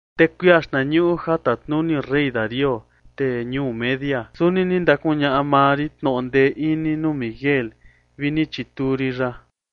Te kuia xtnañuꞌu ja tatnuni rey Darío, tee ñuu Media, suni ni ndakuñaꞌa maa rin tnoꞌo ndee ini nuu Miguel vi ni chituu rin ya.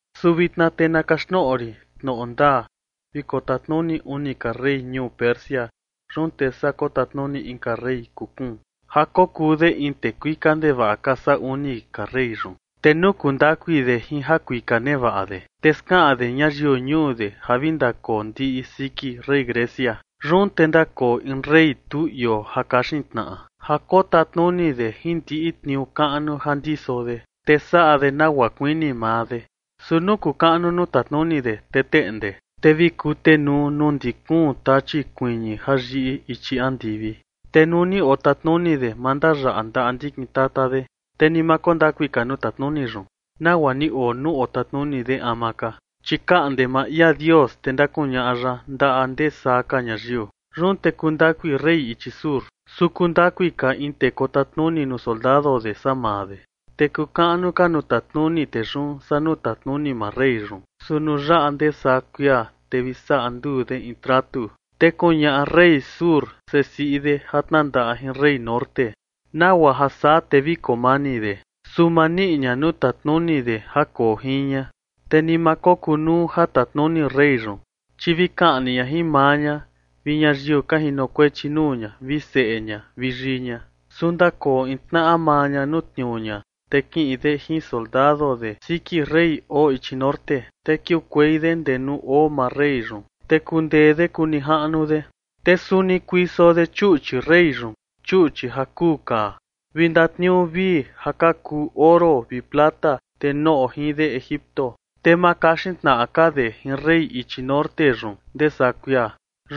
Su vitna te na kaxtnoꞌo rin tnoꞌo ndaa: ―Vi kotatnuni uni ka rey ñuu Persia. Yun te saa kotatnuni inka rey kuu kuun ja kokuu de in tee kuika ndevaꞌa ka saa uni ka rey yun. Te nuu kuu ndakui de jin jakuika nevaꞌa de, te skaꞌan de ñayiu ñuu de ja vi ndakoo ndiꞌi siki rey Grecia. Yun te ndakoo in rey tu ioo ja kaxin tnaꞌa, ja kotatnuni de jin ndiꞌi tniuu kaꞌnu ja ndiso de, te saꞌa de nagua kuini maa de. Su nuu kuu kaꞌnu nuu tatnuni de, te teꞌnde, te vi kutenuu nuu ndi kuun tachi kuiñi ja yiꞌi ichi andivi. Te nuu ni otatnuni de, ma ndayaꞌa ndaꞌa ndikin tata de. Te ni ma koo ndakui ka nuu tatnuni yun, nagua ni oo nuu otatnuni de ama ka, chi kaꞌnde maa ia Dios, te ndakuñaꞌa ya ndaꞌa ndee saa ka ñayiu. Yun te kuu ndakui rey ichi sur, su kuu ndakui ka in tee kotatnuni nuu soldado de saa maa de. Te kuu kaꞌnu ka nuu tatnuni tee yun saa nuu tatnuni maa rey yun. Su nuu yaꞌa ndee saa kuia, te vi saꞌa nduu de in tratu, te kuñaꞌa rey sur sesiꞌi de ja tnandaꞌa jin rey norte, nagua ja saa te vi koo mani de. Su ma niꞌi ña nuu tatnuni de ja koo jin ña, te ni ma kokunuu ja tatnuni rey yun. Chi vi kaꞌni ña jin maa ña, vi ñayiu ka jinokuechi nuu ña, vi seꞌe ña vi yii ña. ’Su ndakoo in tnaꞌa maa ña nuu tniuu ña, te kiꞌin de jin soldado de siki rey oo ichi norte, te kiukuei de ndee nuu oo maa rey yun, te kundee de kuu nijaꞌnu de. Te suni kuiso de chuꞌchi rey yun, chuꞌchi ja kuu kaa, vi ndatniuu vii ja ka kuu oro vi plata, te noꞌo jin de Egipto. Te ma kaxin tnaꞌa ka de jin rey ichi norte yun ndee saa kuia.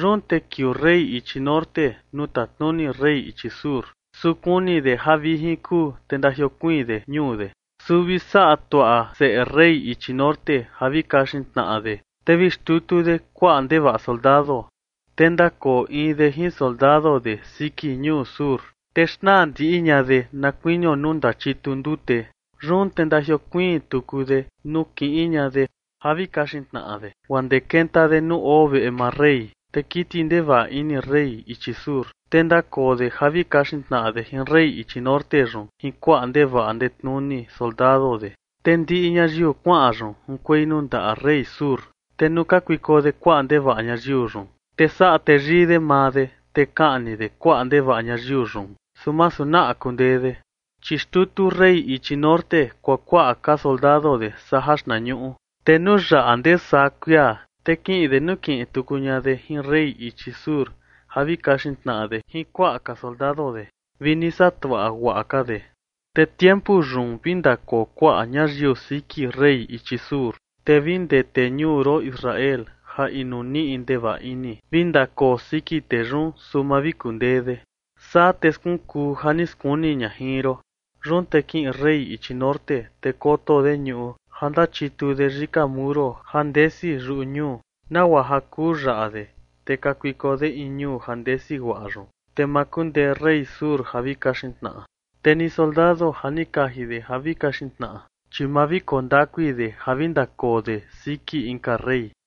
Yun te kiuu rey ichi norte nuu tatnuni rey ichi sur, su kuni de ja vijin kuu, te ndajiokuiin de ñuu de. ’Su vi saꞌa tuaꞌa seꞌe rey ichi norte ja vi kaxin tnaꞌa de, te vi xtutu de kuaꞌa ndevaꞌa soldado. Te ndakoo in de jin soldado de siki ñuu sur, te xnaa ndiꞌi ña de na kuinio nuu ndachitu ndute. Yun te ndajiokuiin tuku de nuu kiꞌin ña de ja vi kaxin tnaꞌa de, guaa ndee kenta de nuu oo veꞌe maa rey. Te kiti ndevaꞌa ini rey ichi sur, te ndakoo de ja vi kaxin tnaꞌa de jin rey ichi norte yun jin kuaꞌa ndevaꞌa ndetnuni soldado de, te ndiꞌi ñayiu kuaꞌa yun junkuei nuu ndaꞌa rey sur. Te nuu kakuiko de kuaꞌa ndevaꞌa ñayiu yun, te saꞌa teyii de maa de, te kaꞌni de kuaꞌa ndevaꞌa ñayiu yun, su masu naꞌa kundee de. Chi xtutu rey ichi norte kuakuaꞌa ka soldado de saa jaxtnañuꞌu, te nuu yaꞌa ndee saa kuia, te kiꞌin de nukiꞌin tuku ña de jin rey ichi sur ja vi kaxin tnaꞌa de jin kuaꞌa ka soldado de, vi ni saꞌa tuaꞌa guaꞌa ka de. ’Te tiempu yun vi ndakoo kuaꞌa ñayiu siki rey ichi sur, te vi ndee tee ñuu ron Israel ja inu niꞌi ndevaꞌa ini vi ndakoo siki tee yun, su ma vi kundee de. Saa te skunkuu ja ni skuni ña jin ron. Yun te kiꞌin rey ichi norte, te koto de ñuꞌu ja ndachitu de yika muro ja ndesi yuꞌu ñuu, nagua ja kuu yaꞌa de. Te kakuiko de in ñuu ja ndesi guaꞌa yun. Te ma kundee rey sur ja vi kaxin tnaꞌa, te ni soldado ja ni kaji de ja vi kaxin tnaꞌa, chi ma vi koo ndakui de ja vi ndakoo de siki inka rey.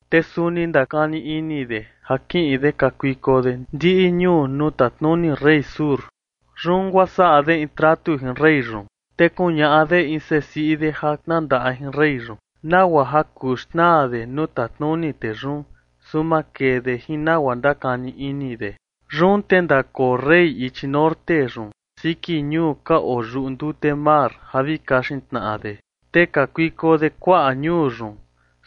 Te suni ndakani ini de ja kiꞌin de kakuiko de ndiꞌi ñuu nuu tatnuni rey sur. Yun guaa saꞌa de in tratu jin rey yun, te kuñaꞌa de in sesiꞌi de ja tnandaꞌa jin rey yun, nagua ja kuu xnaa de nuu tatnuni tee yun, su ma kee de jin nagua ndakani ini de. Yun te ndakoo rey ichi norte yun siki ñuu ka oo yuꞌu ndute mar ja vi kaxin tnaꞌa de. Te kakuiko de kuaꞌa ñuu yun,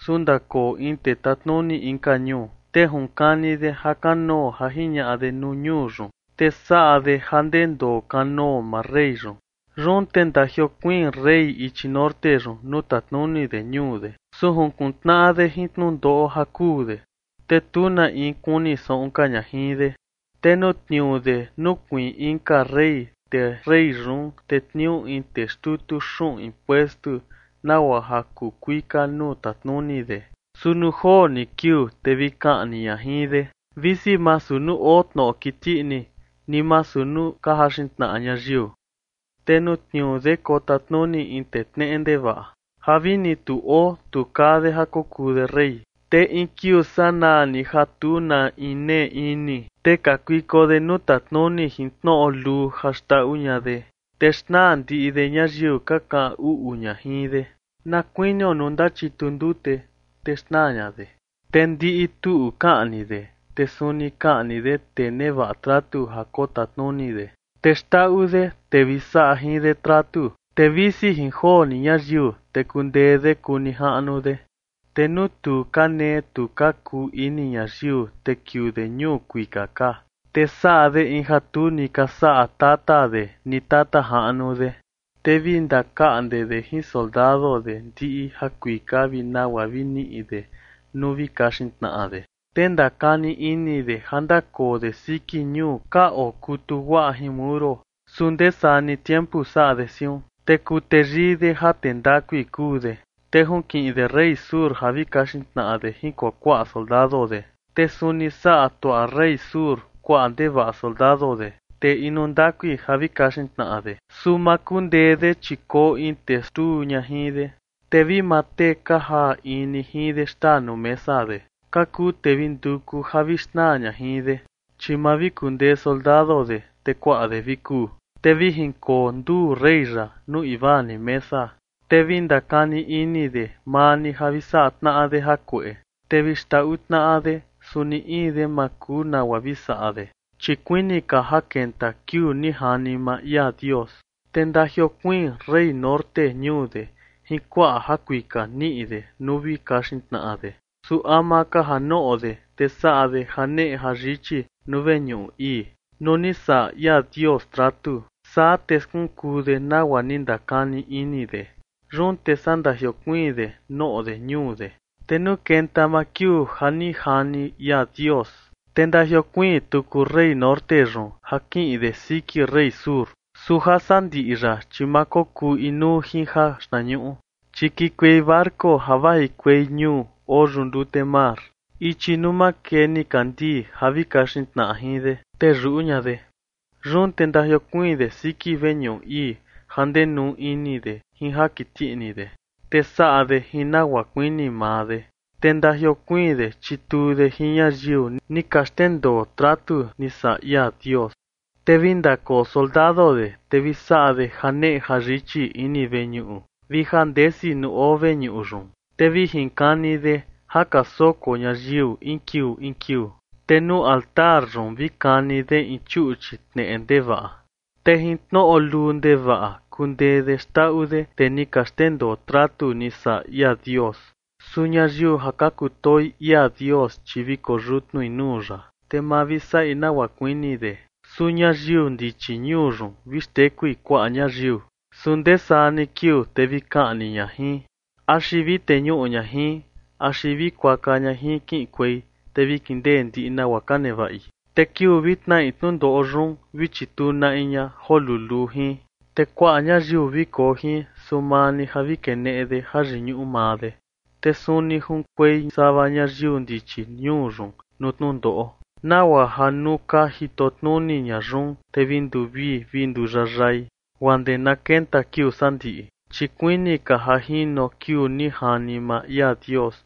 su ndakoo in tee tatnuni inka ñuu, te junkani de ja kanoo ja jiñaꞌa de nuu ñuu yun, te saꞌa de ja ndendoo kanoo maa rey yun. Yun te ndajiokuiin rey ichi norte yun nuu tatnuni de ñuu de, su jinkuntnaꞌa de jin tnundoꞌo ja kuu de, te tu na in kuni saꞌun ka ña jin de. ’Te nuu tniuu de nukuiin inka rey, te rey yun tetniuu in tee xtutu xuꞌun impuestu, nagua ja kuu kuika nuu tatnuni de. Su nuu joo ni kiuu, te vi kaꞌni ña jin de, visi masu nuu oo tnoꞌo kiti ini, ni masu nuu ka jaxin tnaꞌa ñayiu. ’Te nuu tniuu de kotatnuni in tee tneꞌe ndevaꞌa, ja vini tu oo tu kaa de ja kokuu de rey. Te in kiuu sanaa ni ja tu na in nee ini, te kakuiko de nuu tatnuni jin tnoꞌo luu ja xndaꞌu ña de. Te xnaa ndiꞌi de ñayiu ka kaꞌan uꞌu ña jin de, na kuinio nuu ndachitu ndute, te xnaa ña de. Te ndiꞌi tuꞌu kaꞌni de, te suni kaꞌni de tee nevaꞌa tratu ja kotatnuni de. Te xndaꞌu de tee vi saꞌa jin de tratu, te visi jin joo ni ñayiu, te kundee de kuu nijaꞌnu de. Te nuu tu ka nee tu ka kuu ini ñayiu, te kiuu de ñuu kuika ka, te saꞌa de in ja tu ni ka saꞌa tata de ni tata jaꞌnu de. Te vi ndakaꞌnde de jin soldado de ndiꞌi jakuika vi nagua vi niꞌi de nuu vi kaxin tnaꞌa de. Te ndakani ini de ja ndakoo de siki ñuu ka okutu guaꞌa jin muro, su ndee saa ni tiempu saꞌa de siun. ’Te kuu teyii de ja tee ndakui kuu de, te junkiꞌin de rey sur ja vi kaxin tnaꞌa de jin kuakuaꞌa soldado de. Te suni saꞌa tuaꞌa rey sur kuaꞌa ndevaꞌa soldado de, tee inu ndakui ja vi kaxin tnaꞌa de. Su ma kundee de, chi koo in tee xtuu ña jin de. Te vi maa tee ka jaa in ni jin de xtaa nuu mesa de, ka kuu tee vi nduku ja vi xnaa ña jin de, chi ma vi kundee soldado de, te kuaꞌa de vi kuu. Te vi jinkoo nduu rey yaꞌa nuu invaa ni mesa, te vi ndakani ini de maa ni ja vi saꞌa tnaꞌa de jakueꞌe. Te vi xndaꞌu tnaꞌa de, su ni in de ma kuu nagua vi saꞌa de, chi kuini ka ja kenta kiuu ni jani maa ia Dios. Te ndajiokuiin rey norte ñuu de jin kuaꞌa jakuika niꞌi de nuu vi kaxin tnaꞌa de. Su ama ka ja noꞌo de, te saꞌa de janeꞌe jayichi nuu veñuꞌu ii, nuu ni saꞌa ia Dios tratu. Saa te skunkuu de nagua ni ndakani ini de. Yun te saa ndajiokuiin de noꞌo de ñuu de. ’Te nuu kenta maa kiuu ja ni jani ia Dios, te ndajiokuiin tuku rey norte yun ja kiꞌin de siki rey sur. Su jasandiꞌi yaꞌa, chi ma kokuu inuu jin jaxtnañuꞌu. Chi kikuei barco ja vajikuei ñuu oo yuꞌu ndute mar, ichi nuu makee nikandii, ja vi kaxin tnaꞌa jin de, te yuꞌu ña de. Yun te ndajiokuiin de siki veñuꞌu ii ja ndenuu ini de jin ja kiti ini de, te saꞌa de jin nagua kuini maa de. Te ndajiokuiin de chituu de jin ñayiu ni ka xndendoo tratu ni saꞌa ia Dios. ’Te vi ndakoo soldado de, te vi saꞌa de janeꞌe jayichi ini veñuꞌu vi ja ndesi nuu oo veñuꞌu yun. Te vi jinkani de ja ka soko ñayiu in kiuu in kiuu, te nuu altar yun vi kani de in chuꞌchi tneꞌe ndevaꞌa. Te jin tnoꞌo luu ndevaꞌa kundee de xndaꞌu de tee ni ka xndendoo tratu ni saꞌa ia Dios. Su ñayiu ja ka kutoo ia Dios, chi vi koyutnui nuu ya, te ma vi saꞌi nagua kuini de. Su ñayiu ndichi ñuu yun, vi xtekui kuaꞌa ñayiu, su ndee saa ni kiuu, te vi kaꞌni ña jin, axi vi teñuꞌu ña jin, axi vi kuaka ña jin kiꞌinkuei, te vi kindee ndiꞌi nagua ka nevaꞌi. Te kiuu vi tnaꞌi tnundoꞌo yun, vi chituu na in ña joo luluu jin, te kuaꞌa ñayiu vi koo jin, su maa ni ja vi keneꞌe de jayiñuꞌu maa de. Te suni junkuei sava ñayiu ndichi ñuu yun nuu tnundoꞌo, nagua ja nuu ka jito tnuni ña yun, te vi nduvii vi nduyayai, guaa ndee na kenta kiuu sandiꞌi. Chi kuini ka ja jino kiuu ni jani maa ia Dios.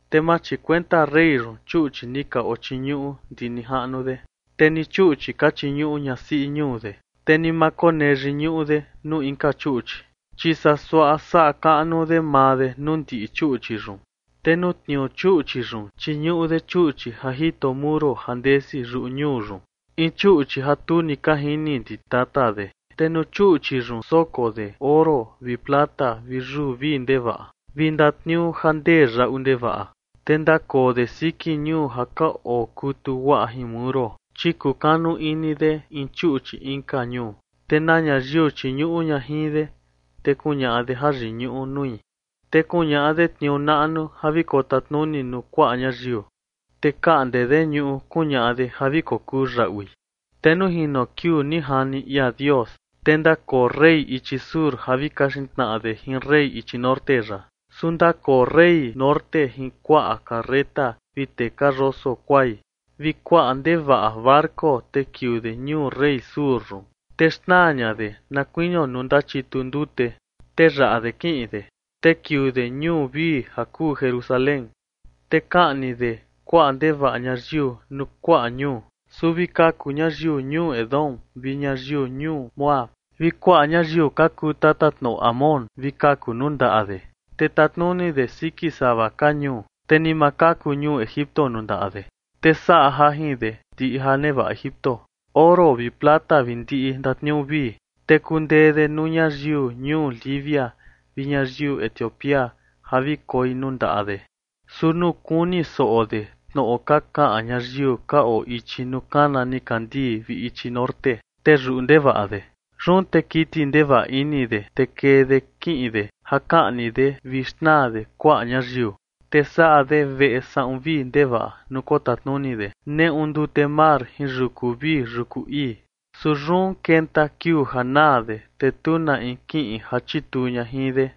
Te ma chikuenta rey yun chuꞌchi ni ka ochiñuꞌu ndi nijaꞌnu de, te ni chuꞌchi ka chiñuꞌu ñasiꞌi ñuu de, te ni ma konee yiñuꞌu de nuu inka chuꞌchi, chi saa suaꞌa saꞌa kaꞌnu de maa de nuu ndiꞌi chuꞌchi yun. Te nuu tniuu chuꞌchi yun, chiñuꞌu de chuꞌchi ja jito muro ja ndesi yuꞌu ñuu yun, in chuꞌchi ja tu ni ka jini ndi tata de. Te nuu chuꞌchi yun soko de oro vi plata vi yuu vii ndevaꞌa, vi ndatniuu ja ndee yaꞌu ndevaꞌa. Te ndakoo de siki ñuu ja ka okutu guaꞌa jin muro, chi kukanu ini de in chuꞌchi inka ñuu. Te na ñayiu chiñuꞌu ña jin de, te kuñaꞌa de jayiñuꞌu nui. Te kuñaꞌa de tniuu naꞌnu ja vi kotatnuni nuu kuaꞌa ñayiu, te kaꞌnde de ñuꞌu kuñaꞌa de ja vi kokuu yaꞌui. ’Te nuu jino kiuu ni jani ia Dios, te ndakoo rey ichi sur ja vi kaxin tnaꞌa de jin rey ichi norte yaꞌa. Su ndakoo rey norte jin kuaꞌa carreta vi tee ka yoso kuai, vi kuaꞌa ndevaꞌa barco, te kiuu de ñuu rey sur yun, te xnaa ña de, na kuinio nuu ndachitu ndute, te yaꞌa de kiꞌin de. Te kiuu de ñuu vii ja kuu Jerusalén, te kaꞌni de kuaꞌa ndevaꞌa ñayiu nuu kuaꞌa ñuu. Su vi kaku ñayiu ñuu Edom vi ñayiu ñuu Moab, vi kuaꞌa ñayiu ka kuu tatatnoꞌo Amón, vi kaku nuu ndaꞌa de. Te tatnuni de siki sava ka ñuu, te ni ma kaku ñuu Egipto nuu ndaꞌa de. Te saꞌa jajin de ndiꞌi ja nevaꞌa Egipto, oro vi plata vi ndiꞌi ndatniuu vii. Te kundee de nuu ñayiu ñuu Libia vi ñayiu Etiopía ja vi koi nuu ndaꞌa de. Su nuu kuni soꞌo de tnoꞌo ka kaꞌan ñayiu ka oo ichi nuu kana nikandii vi ichi norte, te yuꞌu ndevaꞌa de. Yun te kiti ndevaꞌa ini de, te kee de kiꞌin de ja kaꞌni de vi xnaa de kuaꞌa ñayiu. Te saꞌa de veꞌe saꞌun vii ndevaꞌa nuu kotatnuni de neꞌu ndute mar jin yuku vii yuku ii. Su yun kenta kiuu ja naa de, te tu na in kiꞌin ja chituu ña jin de.